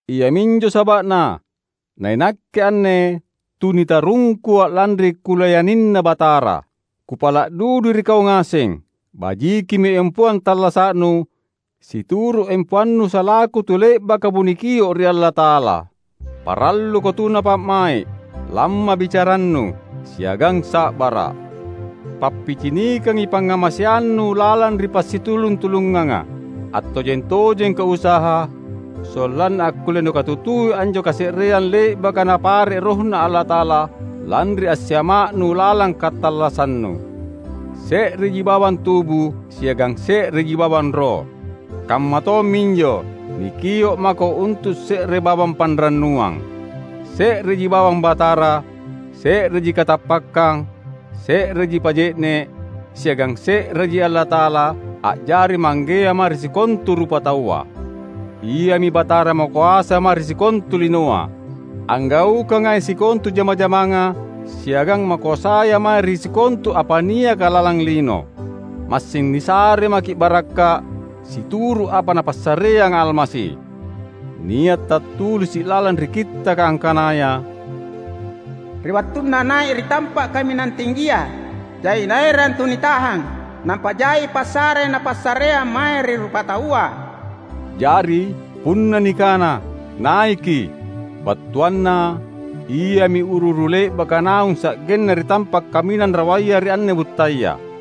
Iaminjo saba’na nainakke anne tu nitarungkua lanri kulayanina Batara, kupala’ dudui ri kau ngaseng: bajikimi empoang tallasa’nu situru’ empoannu salaku tu le’bakamo nikio’ ri Allata’ala. Paralluko tuna pa’mai’, lamma bicarannu, siagang sa’bara’. Pappicinikangi pangngamaseannu lalang ri passitulung-tulunganga. Attojeng-tojengko usaha; sollanna akkulle nukatutui anjo kase’reang le’baka Napare’ RohNa Allata’ala, lanri assiama’nu lalang katallassannu. Se’reji bawang tubu, siagang se’reji bawang Roh. Kamma tomminjo, nikio’ mako untu’ se’re bawang panrannuang. Se’reji bawang Batara, se’reji katappakkang, se’reji pa’je’ne’, siagang se’reji Allata’ala a’jari Manggea mae ri sikontu rupataua. Iami Batara makoasa mae ri sikontu linoa, anggaukangai sikontu jama-jamanga, siagang makoasaya mae ri sikontu apa niaka lalang lino. Massing nisare maki’ barakka’ situru’ apa Napassareanga Almasi. Nia’ tattulisi’ lalang ri Kittaka angkanaya, "Ri wattunNa nai’ ri tampa’ kaminang tinggia, jai Naerang tu nitahang; nampa jai passare Napassareang mae ri rupataua." Jari, punna nikana "naiki" battuanna Iami uru-uru le’baka naung sa’genna ri tampa’ kaminang rawaya ri anne buttaya.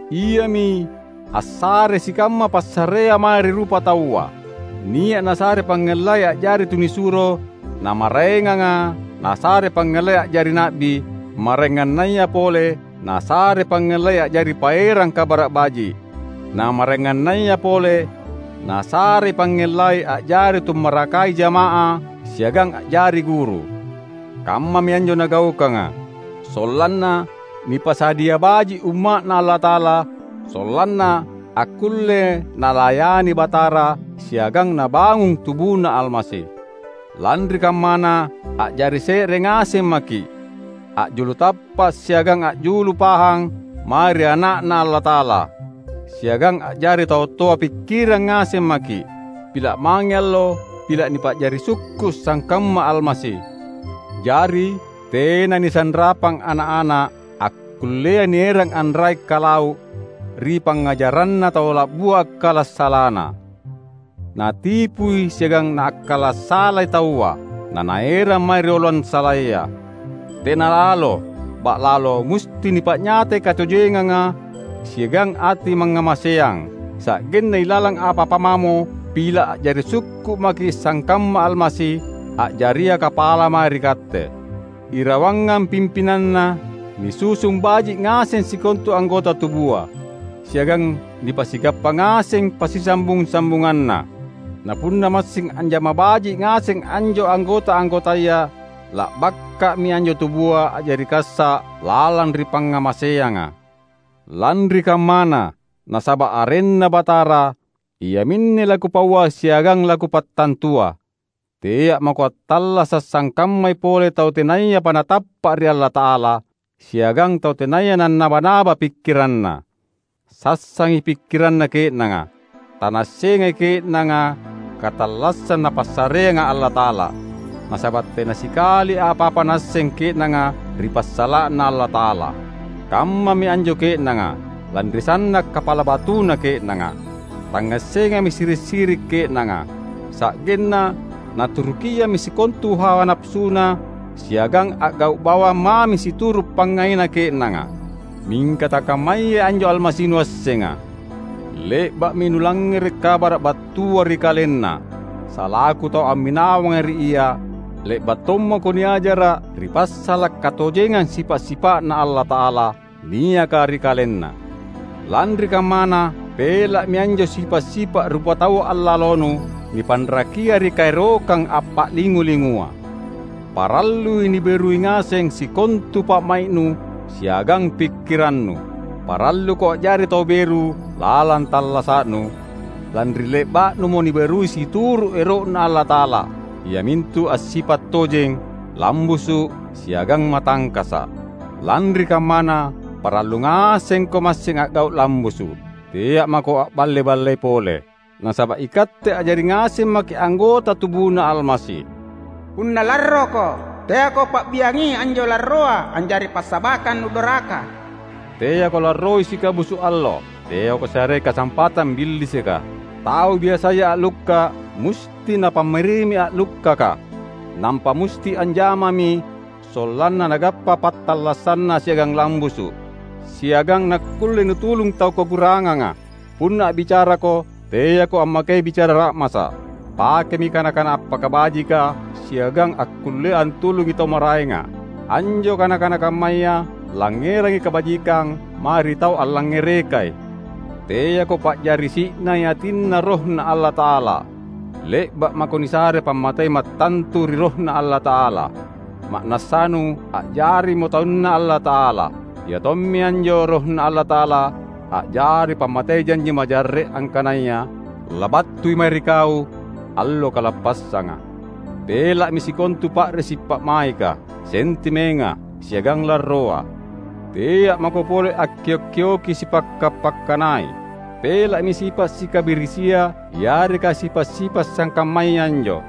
Iami "assarei sikamma passarea mae ri rupataua"; nia’ Nasare pangngellai a’jari tunisuro, na maraenganga Nasare pangngellai a’jari na’bi; maraengannaya pole Nasarei pangngellai a’jari paerang Kabara’ Baji’; na maraengannaya pole Nasarei pangngellai a’jari tummarakai jama’ah siagang a’jari guru. Kammami anjo Nagaukanga, sollanna nipasadia baji’ Umma’Na Allata’ala sollanna akkulle nalayani Batara siagang nabangung TubuNa Almasi. Lanri kammana, a’jari se’re ngaseng maki’, a’julu tappa’ siagang a’julu pahang mae ri Ana’Na Allata’ala. Siagang a’jari tau toa pikkirang ngaseng maki’, pila’ mange allo pila’ nipa’jari sukku’ sangkamma Almasi. Jari, tena nisanrapang ana’-ana’, akkullea nierang anrai’-kalau’ ri pangngajaranna tau la’bua akkala’ salana. Natipui siagang naakkala’ salai taua, nanaerang mae ri oloang salaya. Tena lalo! Ba’lalo, musti nipa’nyatai katojenganga siagang ati mangngamaseang, sa’genna ilalang apa-apa mamo, pila’ a’jari sukku’ maki’ sangkamma Almasi, a’jaria kapala mae ri katte. Irawangang pimpinanNa, nisusung baji’ ngaseng sikontu anggota tubua; siagang nipasigappa ngaseng passisambung-sambunganna. Na punna massing anjama baji’ ngaseng anjo anggota-anggotaya, la’bakka’mi anjo tubua a’jari kassa’ lalang ri pangngamaseanga. Lanri kammana, nasaba’ arenNa Batara, iaminne lakupaua siagang lakupattantua: tea’ mako attallasa’ sangkammai pole tau tenayapa natappa’ ri Allata’ala, siagang tau tenaya nannaba-naba pikkiranna. Sassangi pikkiranna ke’nanga. Tanaassengai ke’nanga katallassang Napassareanga Allata’ala, nasaba’ tena sikali apa-apa naasseng ke’nanga ri passala’na Allata’ala. Kammami anjo ke’nanga, lanri sanna’ kapala batuna ke’nanga. Tangngassengami siri’-siri’ ke’nanga; sa’genna naturukiammi sikontu hawa napasuna siagang a’gau’ bawang mami situru’ pangngaina ke’nanga. Mingka takammayai anjo Almasi nuassenga! Le’ba’mi nulangngere’ kabara’ battua ri KalenNa! Salaku tau amminawanga ri Ia, le’ba’ tommako niajara’ ri passala’ katojengang sipa’-sipa’Na Allata’ala niaka ri KalenNa! Lanri kammana, pela’mi anjo sipa’-sipa’ rupatau allalonu, nipanrakia ri kaerokang appa’lingu-lingua. Parallui niberui ngaseng sikontu pa’mai’nu siagang pikkirannu. Paralluko a’jari tau beru lalang tallasa’nu, lanri le’ba’numo niberui situru’ ero’Na Allata’ala; iamintu assipa’ tojeng, lambusu’, siagang matangkasa’. Lanri kammana, parallu ngasengko massing a’gau’ lambusu’. Tea’ mako a’balle-ballei pole, nasaba’ ikatte a’jari ngaseng maki’ anggota TubuNa Almasi. Punna larroko, teako pa’biangi anjo larroa a’jari passabakkang nudoraka. Teako larroi sikabusu’ allo. Teako sarei kasampatang Billisika. Tau biasaya a’lukka’ musti napammarimi a’lukkaka. Nampa musti anjamami sollanna nagappa pattallasanna siagang lambusu’; siagang nakkulle nutulung tau kakuranganga. Punna a’bicarako, teako ammakei bicara ra’masa’. Pakemi kana-kana appakabajika siagang akkullea antulungi tau maraenga. Anjo kana-kana kammaya langngerangi kabajikang mae ri tau allangngerekai. Teako pa’jari si’nai atinNa RohNa Allata’ala. Le’ba’ mako nisare pammatei mattantu ri RohNa Allata’ala, ma’nassanu a’jarimo taunNa Allata’ala. Ia tommi anjo RohNa Allata’ala a’jari pammatei janji majarre’ angkanaya labattui mae ri kau Allo Kalappassanga. Pela’mi sikontu pa’risi’ pa’maika, sentimenga, siagang larroa. Tea’ mako pole akkio’-kioki sipakka’-pakkanai. Pela’mi sipa’ sikabirisia yareka sipa’-sipa’ sangkammaya anjo.